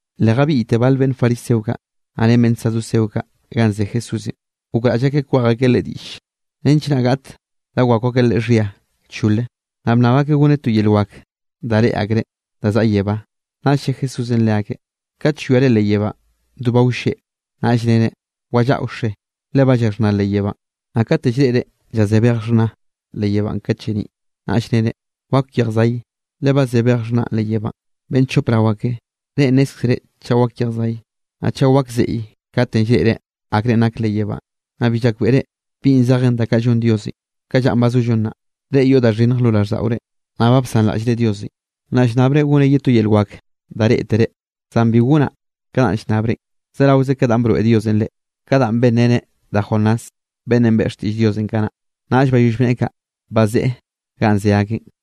Le jabiꞌyte bal beꞌnn fariseo kaꞌ, naꞌ ren beꞌnn saduceo kaꞌ ganꞌ ze Jesúsenꞌ, gokraꞌll akeꞌ kwej akeꞌ Leꞌe diꞌll, nench naꞌ gaꞌt da wakw akeꞌ Leꞌe xhia chole. Naꞌ bnnab akeꞌ goneꞌ to yel wak da reꞌe akreꞌ da zaꞌa yebá. Naꞌll lle Jesúsenꞌ leakeꞌ: —Kat llwiare leꞌ yebánꞌ do ba wlleꞌ, naꞌll nere: “Wallaꞌa wxe, le ba llaxhná leꞌ yebánꞌ.” Naꞌ kate llreꞌre llazé bej xhna leꞌ yebánꞌ kat lleniꞌ, naꞌll nere: “Wak yejw zay, le ba ze bej xhna leꞌ yebánꞌ.” Beꞌnn chop rao ake, reꞌ nnézkzere chaꞌ wak yejw zay, naꞌ chaꞌ wak zeꞌye katenꞌ llreꞌre akre nak leꞌ yebánꞌ, naꞌ bi llayakbeꞌre bi zejen da kaꞌ llon Diosenꞌ ka llanꞌ ba zollo nnaꞌ. Reꞌ yoꞌ da xhinnj lo raꞌlldaꞌore, naꞌ ba bsanraꞌllre Diosenꞌ. Naꞌ llnnabre gonaꞌ ye to yel wak da reꞌtere, zan bi gonaꞌ ka danꞌ llnnabrenꞌ, zeraoze ka danꞌ broeꞌ Diosenꞌ reꞌ, ka danꞌ benreneꞌ da Jonás, beꞌnnenꞌ beꞌe xtiꞌll Diosenꞌ kanaꞌ. Naꞌll bayoll bneꞌe kaꞌ, bazeꞌe ganꞌ ze akeꞌn.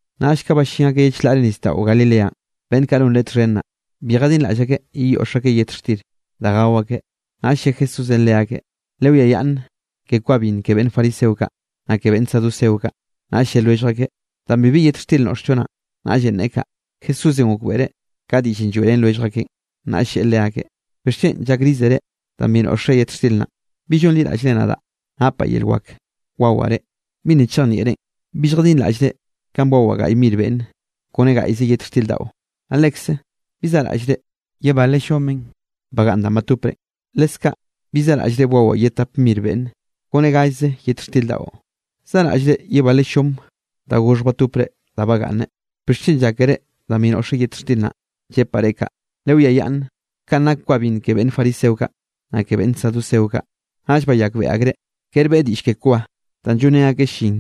Naꞌll ka ballín akeꞌ ye chlaꞌre nisdaꞌo Galileanꞌ, beꞌnn kaꞌ non Leꞌe txhen naꞌ, bi jadinraꞌll akeꞌ yeyoꞌx akeꞌ yet xtir da gao akeꞌ. Naꞌll lle Jesúsenꞌ leakeꞌ: —Lewiayaꞌnn ke kwa binn ke beꞌnn fariseo kaꞌ, naꞌ ke beꞌnn saduceo kaꞌ. Naꞌll lle lwellj akeꞌ: —Danꞌ bibi yet xtir noꞌxllo naꞌn, naꞌllenꞌ neꞌe kaꞌ. Jesúsenꞌ gokbeꞌreꞌ ka diꞌllenꞌ lloeꞌrén lwellj akeꞌn, naꞌll lleꞌe leakeꞌ: —¿Bixchen llakrizere danꞌ bi noꞌxre yet xtir naꞌ? ¿Bi llonliraꞌllre nadaꞌ napaꞌ yel wak wawaꞌ reꞌ? ¿Bi nna chejnieꞌren? ¿Bi lljadinraꞌllre kanꞌ bwawaꞌ gaꞌy mir beꞌnne kone gaꞌyze yet xtir daꞌo? Naꞌ lekze, ¿bi zaꞌraꞌllre ye bale llomenꞌ bagaꞌnn danꞌ batoprenꞌ? Leskaꞌ ¿bi zaraꞌllre bwawaꞌ ye tap mir beꞌnne, kone gallze yet xtir daꞌo? ¿Zaꞌraꞌllre ye bale llom da goxhj batopre da bagaꞌnne? ¿Bixchen llákere danꞌ bi noꞌxre yet xtir naꞌn, llepaꞌ reꞌ kaꞌ, lewiayaꞌnn kanꞌ nak kwa binn ke beꞌnn fariseo kaꞌ, naꞌ ke beꞌnn saduceo kaꞌ? Naꞌll bayakbeꞌe akreꞌ, kere beꞌe diꞌll ke kwa danꞌ llonrén akeꞌ llin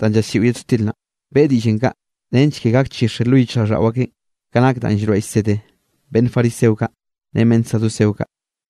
danꞌ llaslliꞌo yet xtir naꞌ, beꞌe diꞌllenꞌ kaꞌ, nench ke gakchixe lo yichjraꞌlldaꞌo akeꞌn ka nak danꞌ llroeꞌ llsed beꞌnn fariseo kaꞌ ren beꞌnn saduceo kaꞌ.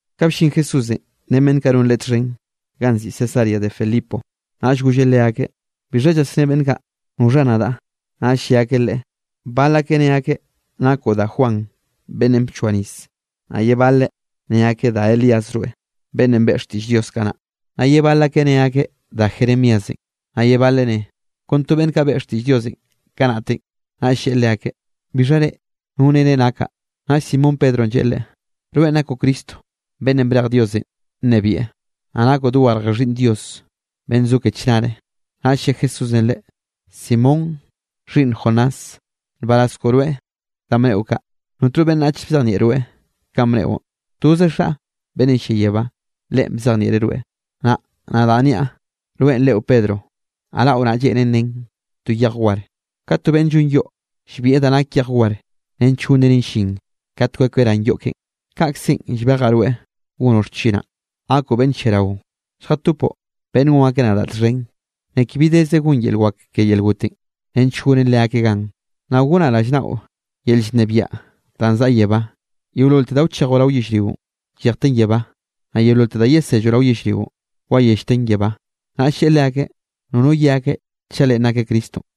Ka bllin Jesúsenꞌ ren beꞌnn kaꞌ non Leꞌe txhen, ganꞌ nziꞌi Cesarea de Filipo, naꞌll golleꞌ leakeꞌ: —¿Bixha llasné beꞌnn kaꞌ noxha nadaꞌ? Naꞌll lle akeꞌ Leꞌe: —Bal akeꞌ ne akeꞌ nakoꞌ da Juan beꞌnnenꞌ bchoa nis. Naꞌ ye baleꞌ ne akeꞌ da Elías rweꞌ, beꞌnnenꞌ beꞌe xtiꞌll Dios kanaꞌ. Naꞌ ye bal akeꞌ ne akeꞌ da Jeremíasenꞌ, naꞌ ye baleꞌ ne, kon to beꞌnn kaꞌ beꞌe xtiꞌll Diosenꞌ kanaꞌtenꞌ. Naꞌll lleꞌe leakeꞌ: —¿Bixha reꞌ? ¿No nere nakaꞌ? Naꞌll Simón Pedronꞌ lleꞌe Leꞌe: —Rweꞌn nakoꞌ Cristo beꞌnnenꞌ brej Diosenꞌ nnebieꞌ, naꞌ nakoꞌ dogarje Xhiꞌnn Dios beꞌnn zo ke chnare. Naꞌll lle Jesúsenꞌ leꞌe: —Simón, xhiꞌnn Jonás, nbaraz koꞌo rweꞌ danꞌ bneꞌo kaꞌ, notno beꞌnnach bzejnieꞌ rweꞌ kanꞌ bneꞌon. Toze Xaꞌ beꞌnnenꞌ llia yebá, Leꞌen bzejnieꞌreꞌ rweꞌ. Naꞌ nadaꞌ niaꞌ, rweꞌn reꞌo Pedro, naꞌ raꞌo naꞌ, lleꞌnen nen to yej war. Ka to beꞌnn llon yoꞌ llbieꞌ da nak yej war, nench gonreneꞌn llin kat kwekeꞌ ran yoꞌ keꞌen, kaꞌkzenꞌ llbejaꞌ rweꞌ gonoꞌ xchinaꞌ, gakoꞌ beꞌnn lliarao lljatopoꞌ beꞌnn gon akeꞌ nadaꞌ txhen. Ni ke bi deze gon yel wak ke yel gotenꞌ, nench gonen leakeꞌ gan. Naꞌ gonaꞌ rallnaꞌo yel llnebiaꞌ danꞌ zaꞌa yebá. Yeololte da wchejoꞌ rao yellrionꞌ, llejten yebá, naꞌ yeololte da yeselloꞌ rao yellrionꞌ, wayellten yebá. Naꞌll lleꞌe leakeꞌ nono ye akeꞌ chaꞌ Leꞌen nakeꞌ Cristonꞌ.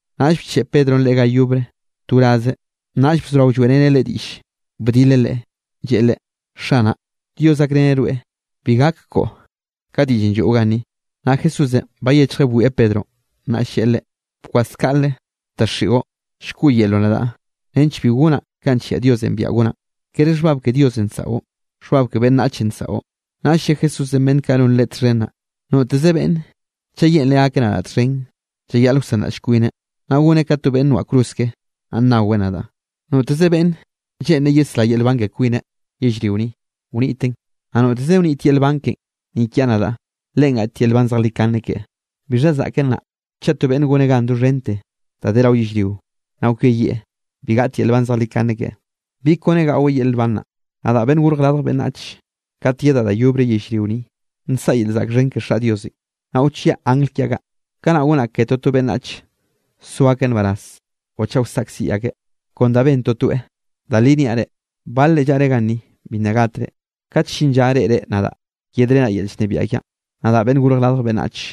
Naꞌll bcheꞌe Pedronꞌ Leꞌe ga yobre to wraze, naꞌll bzorao lloeꞌreneꞌ Leꞌe diꞌll, bdileꞌ Leꞌe, lleꞌe Leꞌe: —Xanaꞌ, Dios gakreneꞌ rweꞌ bi gak koꞌo ka diꞌllenꞌ lloeꞌo ganni. Naꞌ Jesúsenꞌ bayechjeꞌ bwieꞌ Pedronꞌ, naꞌll lleꞌe leꞌe: —¡Kwas kaꞌle, daxiꞌo! Llkoꞌyelroꞌ nadaꞌ nench bi gonaꞌ kanꞌ nllia Diosenꞌ biaꞌa gonaꞌn, kere xhbab ke Diosenꞌ nsaꞌo, xhbab ke beꞌnnachenꞌ nsaꞌo. Naꞌll lle Jesúsenꞌ beꞌnn kaꞌ non Leꞌe txhen naꞌ: —Noteze beꞌnn chaꞌ lleꞌnreꞌ gakeꞌ nadaꞌ txhen, llayaꞌl wsanraꞌll kwineꞌ, naꞌ goneꞌ ka to beꞌnn noaꞌ cruz keꞌe, naꞌ nnaweꞌ nadaꞌ. Noteze beꞌnn lleꞌnreꞌ yesrá yel nban ke kwineꞌ yellrio ni, wniteꞌn, naꞌ noteze wnit yel nban keꞌen ni kiaꞌ nadaꞌ, leꞌen gaꞌt yel nban zejlikane keꞌe. ¿Bixha zaꞌken naꞌ, chaꞌ to beꞌnne goneꞌ gan doxhente da de rao yellrio, naꞌ kweyieꞌ, bi gaꞌt yel nban zejlikane keꞌe? ¿Bi kone gaꞌweꞌ yel nban naꞌ? Nadaꞌ Beꞌnnenꞌ Gorj Radj Beꞌnnach kat yedaꞌ da yobre yellrio ni nsaꞌa yel zaꞌk xhen ke Xaꞌ Diosenꞌ, naꞌ wchiaꞌ angl kiaꞌ kaꞌ, kanaꞌ gonaꞌ ke toto beꞌnnach so akeꞌ nbaraz o chaꞌ wsaꞌkziꞌ akeꞌ, kon da ben totoeꞌ. Da li niaꞌ reꞌ, balre llaꞌre ganni bi nna gatre, kat llin lla reꞌre nadaꞌ yedrenaꞌ yel llnebiaꞌ kiaꞌn, nadaꞌ Beꞌnn Gorj Radj Beꞌnnach.